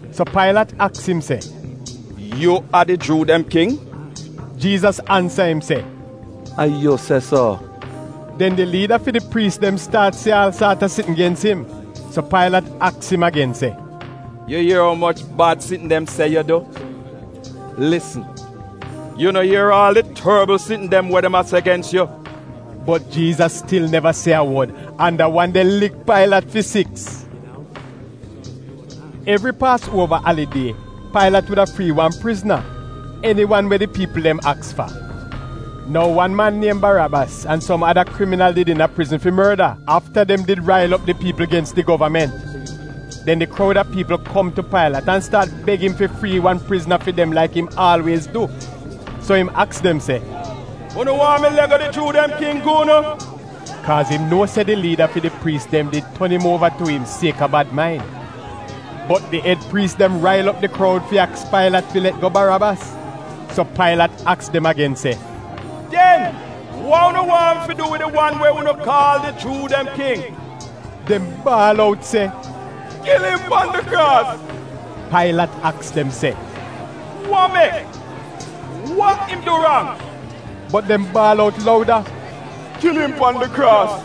So Pailat aks im se, “Yu a di Juu dem king?” Jiizas ansa im se, “A yu se so.” Den di liida fi di priis dem staat se aal saat a sitn gens im. So Pailat aks im agen se, “Yu ier umoch bad sitn dem se yu du? Lisn! Yu no ier aal di torbl sitn dem we dem a se gens yu!” Bot Jiizas stil neva se a wod, an da wan de lik Pailat fi siks! Evri Paasuova Alidie Pailat wuda frii wan prizna — eni wan we di piipl dem aks fa. Nou wan man niem Barabas an som ada kriminal did iina prizn fi morda afta dem did rail op di piipl gens di govament. Den di kroud a piipl kom tu Pailat an staat beg im fi frii wan prizna fi dem laik im aalwiez du. So im aks dem se, “Unu waahn mi le'go di Juu dem King gi unu?” (Kaaz im nuo se di liida fi di priis dem did ton im uova tu im sieka bad main.) Bot di ed priis dem rail op di kroud fi aks Pailat fi let go Barabas. So Pailat aks dem agen se, “Den wa unu waahn mi fi du wid di wan we unu kaal di Juu dem King?” Dem baal out, “Kil im pan di kraas!” Pailat aks dem se, “Wa mek? Wa im du rang?” Bot dem baal out louda, “Kil im pan di kraas!”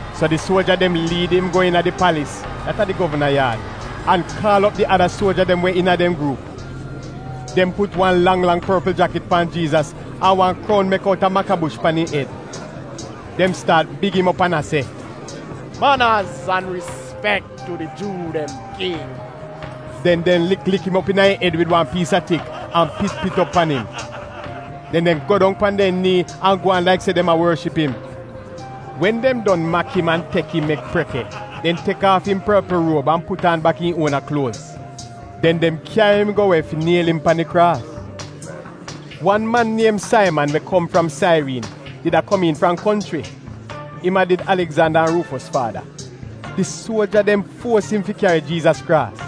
So di suoja dem liid im go iina di palis (dat a di govana yaad) an kaal op di ada suoja dem we iina dem gruup. Dem put wa lang lang porpl jakit pan Jiizas, an wan kroun mek outa makabush pan im ed. Dem staat big im op an a se “Manaz an rispek tu di Juu dem King.” Den dem lik lik im op iina im ed wid wan piis a tik an pit pit op pan im. Den dem go dong pan dem nii an gwaan laik se dem a worship im. Wen dem don mak im an tek im mek preke, dem tek aaf im porpl ruob an put aan bak im uona kluoz. Den dem kyari im go we fi niel im pan di kraas. Wan man niem Saiman we kom fram Sairiin did a komiin fram konchri (im a did Aligzanda an Ruufos faada). Di suoja dem fuos im fi kyari Jiizas kraas.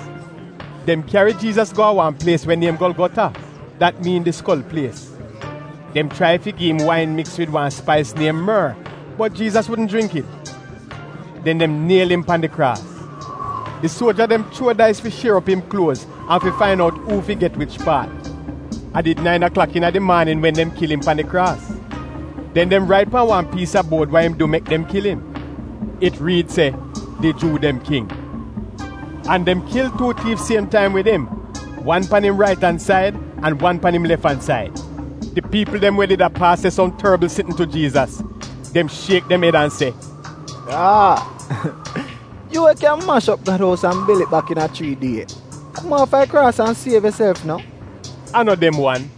Dem kyari Jiizas go a wan plies we niem Golgota, (dat miin Di Skol Plies). Dem chrai fi gi im wain miks wid wan spais niem mor, bot Jiizas wudn jringk it. Den dem niel im pan di kraas. Di suoja dem chuo dais fi shier op im kluoz an fi disaid uu fi get wich paat. A did nain aklak iina di maanin wen dem kil im pan di kraas. Den dem rait pan wan piis a buod wa im du mek dem kil im. It riid se, “DI JUU DEM KING.” An dem kil tuu tiif siem taim wid im, wan pan im rait an said an wan pan im lef an said. Di piipl dem we did a paas se som torbl sitn tu Jiizas. Dem shiek dem ed an se, “Aa! Yu, we kyan mash op Gad ous an bil it bak iina chrii die! Kom aafa di kraas an siev yuself no!” A no dem wan,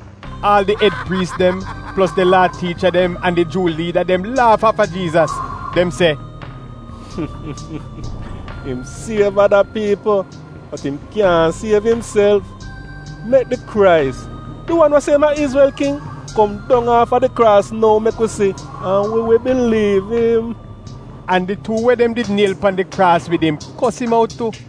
aal di ed priis dem, plos di Laa tiicha dem an di Juu liida dem laaf aafa Jiizas. Dem se “Im siev ada piipl, bot im kyaahn siev imself! Mek di Krais, di wan we se im a Izrel king, kom dong aafa di kraas nou mek wi si an wi wi biliiv im!” An di tuu we dem did niel pan di kraas wid im kos im out tu.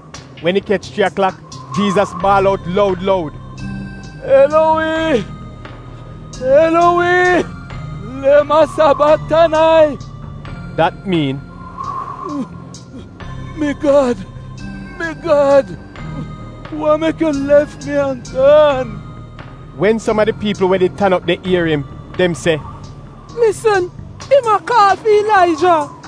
Wen it kech chrii aklak, Jiizas baal out loud, loud, “Elowi, Elowi, lema sabaktanai?” Dat miin, “Mi Gad, mi Gad, wa mek yu lef mi an gaan?” Wen som a di piipl we did tan op de ier im, dem se, “Lisn, im a kaal fi Ilaija!”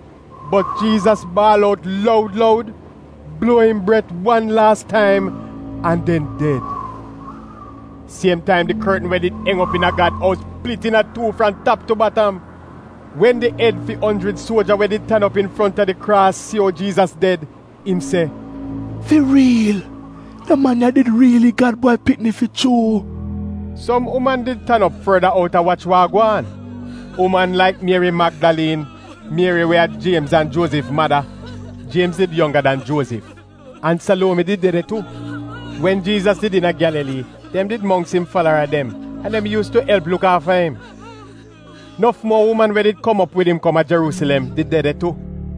Bot Jiizas baal out loud loud, bluo im bret wan laas taim an den ded. Siem taim di kortn we did eng op iina Gad ous plit iina tuu fram tap tu batam. Wen di ed fi onjrid suoja we did tan op infronta di kraas si ou Jiizas ded, im se, “Fi riil, da man ya a did riili Gad Bwai Pikni fi chuu!” Som uman did tan op forda out a wach wa a gwaan. Uman laik Mieri Magdaliin, Mieri we a Jiemz an Juozif mada (Jiemz did wan we yongga dan Juozif), an Saluomi did de de tu. Wen Jiizas did iina Gyalalii dem did mongks im falara dem an dem yuus tu elp luk aafa im. Nof muo uman we did kom op wid im kom a Jeruusilem did de de tu.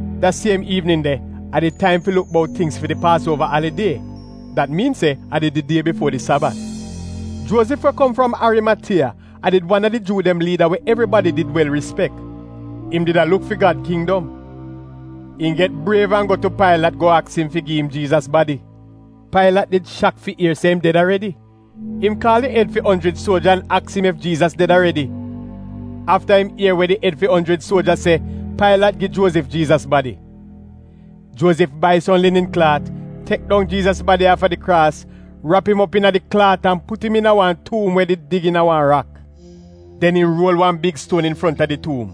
Da siem iivnin de, a did taim fi luk bout tingz fi di Paasuova alidie (dat miin se a did di die bifuo di Sabat), Juozif we kom fram Arimatiya a did wan a di Juu dem liida we evribadi did wel rispek. Im did a luk fi Gad kindom. Im get briev an go tu Pailat go aks im fi gi im Jiizas badi. Pailat did shak fi ier se im ded aredi. Im kaal di ed fi onjrid suoja an aks im ef Jiizas ded aredi. Afta im ier we di ed fi onjrid suoja se, Pailat gi Juozif Jiizas badi. Juozif bai som linin klaat, tek dong Jiizas badi aafa di kraas, rap im op iina di klaat an put im iina wan tuum we did dig iina wan rak. Den im ruol wan big stuon infront a di tuum.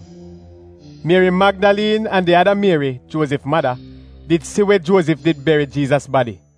Mieri Magdaliin an di ada Mieri, Juozif mada, did si we Juozif did beri Jiizas badi.